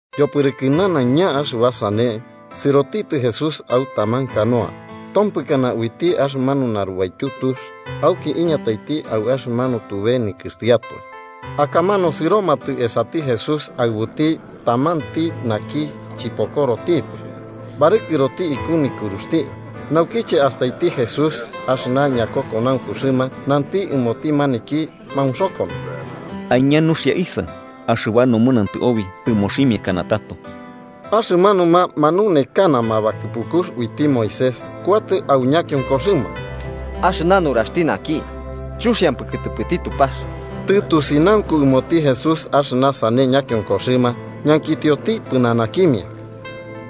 Yopɨrɨkɨ nanaiña axɨba sane, sɨrotitɨ Jesús au taman canoa, tompɨkana uiti axɨmanu narubaityu tux auki iñataiti au axɨmanu tube nikɨxtiatoe. Akamanu sɨromatɨ esati Jesús aɨbuti tamanti naki chɨpokorotipɨ, barɨkɨroti iku nikɨruxti. Naukiche astaiti Jesús axɨna ñakokonaunkuxɨma, nanti ɨmoti maniki maunxokono: –Aiña nuxia, isaɨ. Axɨba nomɨnantɨ obi tɨmoximiakana tato. Axɨmanuma manunekanama bakɨpukux uiti Moisés kuatɨ au ñakionkoxɨma: “Axɨna nuraxti naki chuxiampɨ kɨtɨpɨti Tupax.” Tɨtusinaunku ɨmoti Jesús axɨna sane ñakionkoxɨma, ñankitioti pɨnanakimia: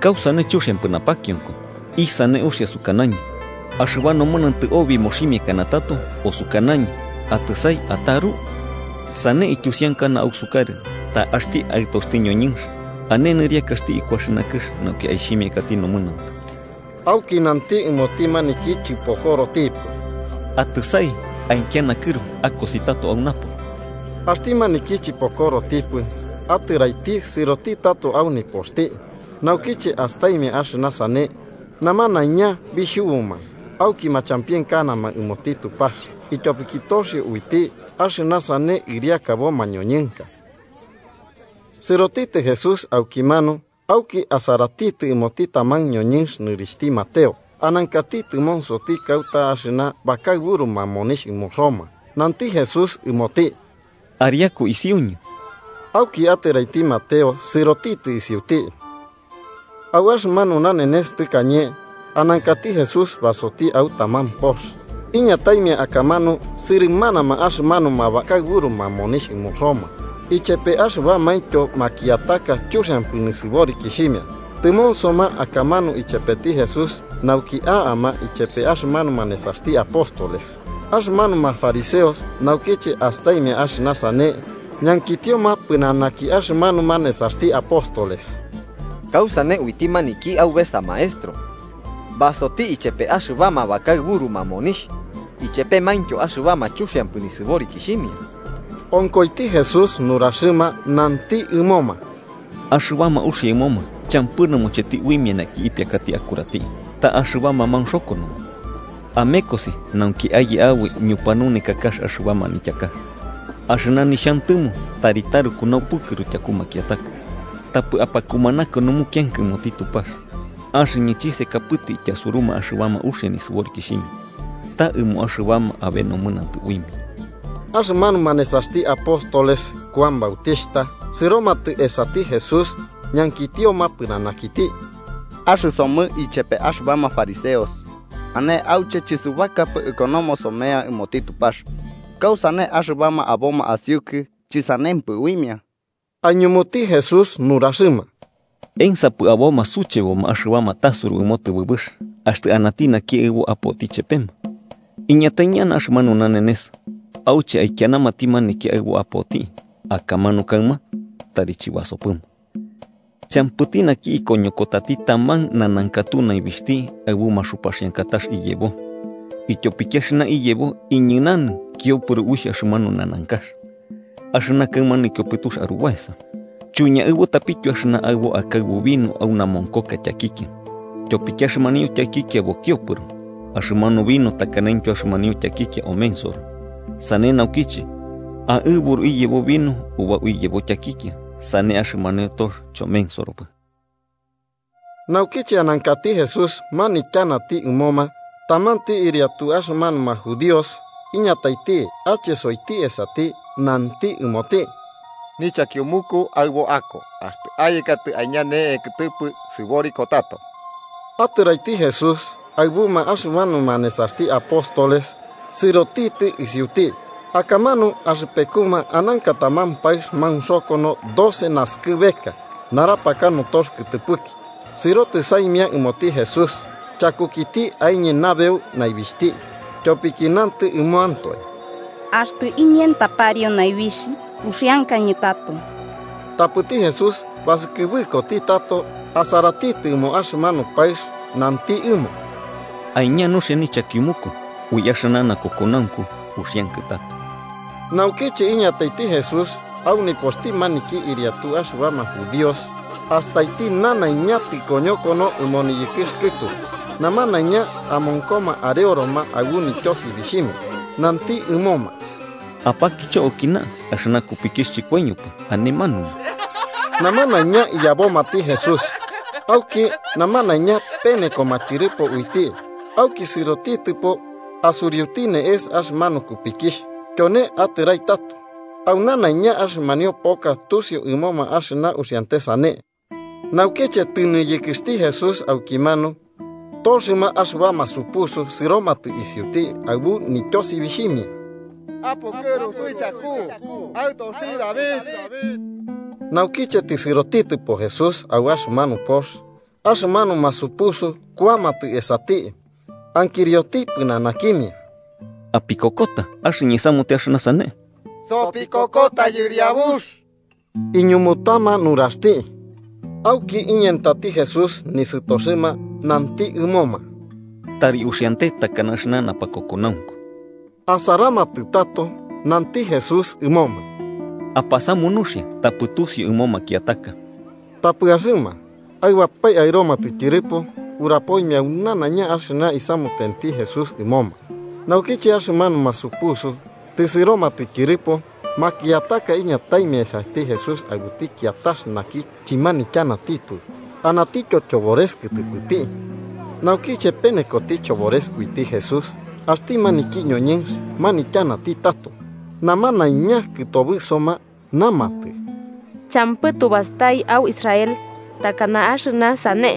–¿Kausane chuxiampɨ napakionko? ¿Isane uxia, sukanañɨ: ‘Axɨba nomɨnantɨ obi moximiakana tato’, o sukanañɨ: ‘Atɨsai ataru’? Sane ityusiankana ausukarɨ ta axti Aɨtoxti ñoñɨnx ane nɨriakaxti iku axɨna kɨx nauki aixhimiakati nomɨnantɨ. Auki nanti ɨmoti maniki chɨpokorotipɨ: –Atɨsai, aikia nakɨru akosi tato au napo. Axti maniki chɨpokorotipɨ atɨraiti sɨrotitɨ tato au nipoxti. Naukiche astaimia axɨna sane, namanaiña bixhubuma auki Machampienkanama ɨmoti Tupax ityopiki toxio uiti axɨna sane ɨriakabo mañoñɨnka. Sɨrotitɨ Jesús aukimanu auki asaratitɨ ɨmoti taman ñoñɨnx nɨrixhti Mateo, anankati tɨmonsoti kauta axɨna bakaɨburuma monixh ɨmo Roma. Nanti Jesús ɨmoti: –Ariaku isiuñɨ. Auki atɨraiti Mateo sɨrotitɨ isiuti. Au axɨmanu nanenes tɨkañe, anankati Jesús basoti au taman pox, iñataimia akamanu sɨrɨmanama axɨmanuma bakaɨburuma monixh ɨmo Roma, ichepe axɨbamaintyo makiataka chuxiampɨ nisɨborikixhimia, tɨmonsoma akamanu ichepeti Jesús nauki a'ama Ichepe axɨmanuma nesaxti apóstoles. Axɨmanuma fariseos, naukiche astaimia axɨna sane ñankitioma pɨnanaki axɨmanuma nesaxti apóstoles: –¿Kausane uiti maniki aubesa maestro basoti ichepe axɨbama bakaɨburuma monixh ichepemaintyo axɨbama chuxiampɨ nisɨborikixhimia? Onkoiti Jesús nuraxɨma nanti ɨmoma: –Axɨbama uxia ɨmoma champɨ nɨmocheti uimia naki ipiakati akurati, ta axɨbama maunxokonoma. Amekosi nauki aye aboi ñupanunekakax axɨba manityakax: ‘Axɨna nixhantɨmo tari taruku naupukɨru tyaku makiataka, tapɨ apakumanaka numukianka ɨmoti Tupax.’ Axɨñɨ chisekapɨtɨ ityasuruma axɨbama uxia nisɨborikixhimia, ta ɨmo axɨbama abe nomɨnantɨ uimia. Axɨmanuma nesaxti apóstoles Kuan Bautixhta sɨromatɨ esati Jesús ñankitioma pɨnanakiti: –Axɨsomɨ ichepe axɨbama fariseos ane auche chɨsubakapɨ ikonomo somea ɨmoti Tupax, ¿kausane axɨbama aboma asiukɨ chɨsanempɨ uimia? Aiñumuti Jesús nuraxɨma: –¿Ensapɨ aboma sucheboma axɨbama tasuru ɨmo tɨbɨbɨx, axtɨ anati naki aɨbo apoti chepema? Iñatai ñana axɨmanu nanenes auche aikianamati maniki aɨbo apoti. Akamanu kaɨma tari chɨbasopɨma. “Champɨti naki ikoñokotati taman nanankatu naibixhti aɨbu maxupaxiankatax iyebo, ityopiki axɨna iyebo iñɨnanɨ kiopɨro uixh axɨmanu nanankax, axɨna kaɨma nikiopɨtux arubaesa. Chuiñaɨbutapityo axɨna aɨbo akaɨbu vino au namonkoka tyakikia, tyopiki axɨmanio tyakikia bokiopɨro, axɨmanu vino takanaintyo axɨmanio tyakikia omensoro. Sane naukiche aɨburu iyebo vino ubau iyebo tyakikia, sane axɨmanio tox chomensoropɨ.” Naukiche anankati Jesús manityanati ɨmoma, tamanti ɨriatu axɨmanuma judíos iñataiti, achesoiti esati nanti ɨmoti: –Nichakiumuku aɨbo ako. Axtɨ ayekatɨ aiña ne'e kɨtɨpɨ, sɨboriko tato. Atɨraiti Jesús, aɨbuma axɨmanuma nesaxti apóstoles sɨrotitɨ isiuti. Akamanu axɨpekuma ananka taman paɨx maunxokono doce naskɨbeka, narapaka notox kɨtɨpɨki, sɨrotɨ saimia ɨmoti Jesús chakukiti aiñe nabeu naibixhti. Tyopiki nantɨ ɨmoantoe: “Axtɨ iñenta pariu naibixh, uxiankañɨ tato.” Tapɨti Jesús basɨkɨbɨkoti tato, asaratitɨ ɨmo axɨmanu paɨx nanti ɨmo: –Aiña nuxia nichakiumuku, ui axɨna nakokonaunku uxiankɨ tato. Naukiche iñataiti Jesús au nipoxti maniki ɨriatu axɨbama judíos, astaiti nanaiña tɨkoñokono ɨmo niyɨkɨx kɨtu namanaña amonkoma areoroma aɨbu nityosibixhimia, nanti ɨmoma: –Apakicho aukina, axɨna kupikixh chɨkoiñopɨ, ane manumu. Namanaiña iyabomati Jesús, auki namanaiña penekoma tyɨrɨpo uiti, auki sɨrotitɨpo asuriuti ne'es axɨmanu kupikixh, tyone atɨrai tato. Au nanaiña axɨmanio poka tusiu ɨmoma axɨna uxiante sane. Naukiche tɨniyɨkɨxti Jesús aukimanu, toxɨma axɨbama supusu sɨromatɨ isiuti, aɨbu nityosibixhimia: –¡Apukɨru suichaku, Aɨtoxti David! Naukiche tɨsɨrotitɨpo Jesús au axɨmanu pox, axɨmanuma supusu kuamatɨ esati, ankirioti pɨnanakimia: –¿Apikokota axɨñɨ isamute axɨna sane? –Sopikokota, Yɨriabux–iñumutama nuraxti. Auki iñentati Jesús nisɨtoxɨma, nanti ɨmoma: –Tari uxiante takana axɨna napakokonaunku. Asaramatɨ tato. Nanti Jesús ɨmoma: –Apasamu nuxia tapɨ tusiu ɨmo makiataka. Tapɨ axɨma, aɨbapae aɨromatɨ tyɨrɨpo, urapoimia au nanaiña axɨna isamutenti Jesús ɨmoma. Naukiche axɨmanuma supusu tɨsɨromatɨ tyɨrɨpo, makiataka iñataimia esati Jesús aɨbuti kiatax naki chɨmanityanatipɨ anatityo chobores kɨtɨpɨti. Naukiche penekoti chobores uiti Jesús, axti maniki ñoñɨnx manityanati tato. Namanaiña, kɨtobɨsoma, namatɨ: –Champɨ tubastai au Israel takana axɨna sane.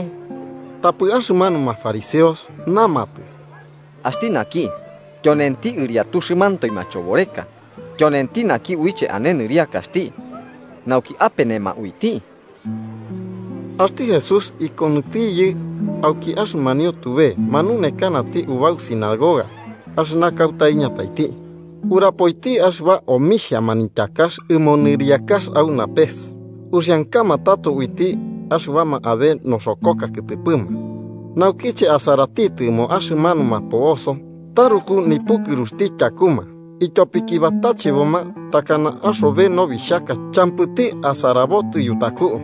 Tapɨ axɨmanuma fariseos namatɨ: –Axti naki tyonenti ɨriatuxɨmantoe machoboreka tyonenti naki uiche ane nɨriakaxti nauki apenema uiti. Axti Jesús ikonɨtiyɨ auki axɨmanio tube, manunekanati ubau sinagoga axɨna kauta iñataiti. Urapoiti axɨba omixhia manityakax ɨmo nɨriakax au napes, uxiankama tato uiti axɨbama abe noxokoka kɨtɨpɨma. Naukiche asaratitɨ ɨmo axɨmanuma po'oso, taruku nipukɨruxti tyakuma, ityopiki batacheboma, takana axobe nobixhaka champɨti asarabotɨ yutaku.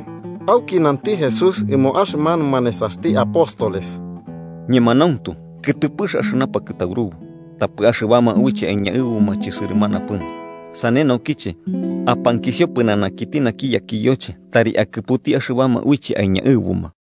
Auki nanti Jesús ɨmo axɨmanuma nesaxti apóstoles: –Ñemanauntu kɨtɨpɨx axɨna pakɨtaurubu, tapɨ axɨbama uiche aiñaɨbuma chɨsɨrɨmanapɨma. Sane naukiche, apankisio pɨnanakiti naki yakiyoche tari akɨputi axɨbama uiche aiñaɨbuma.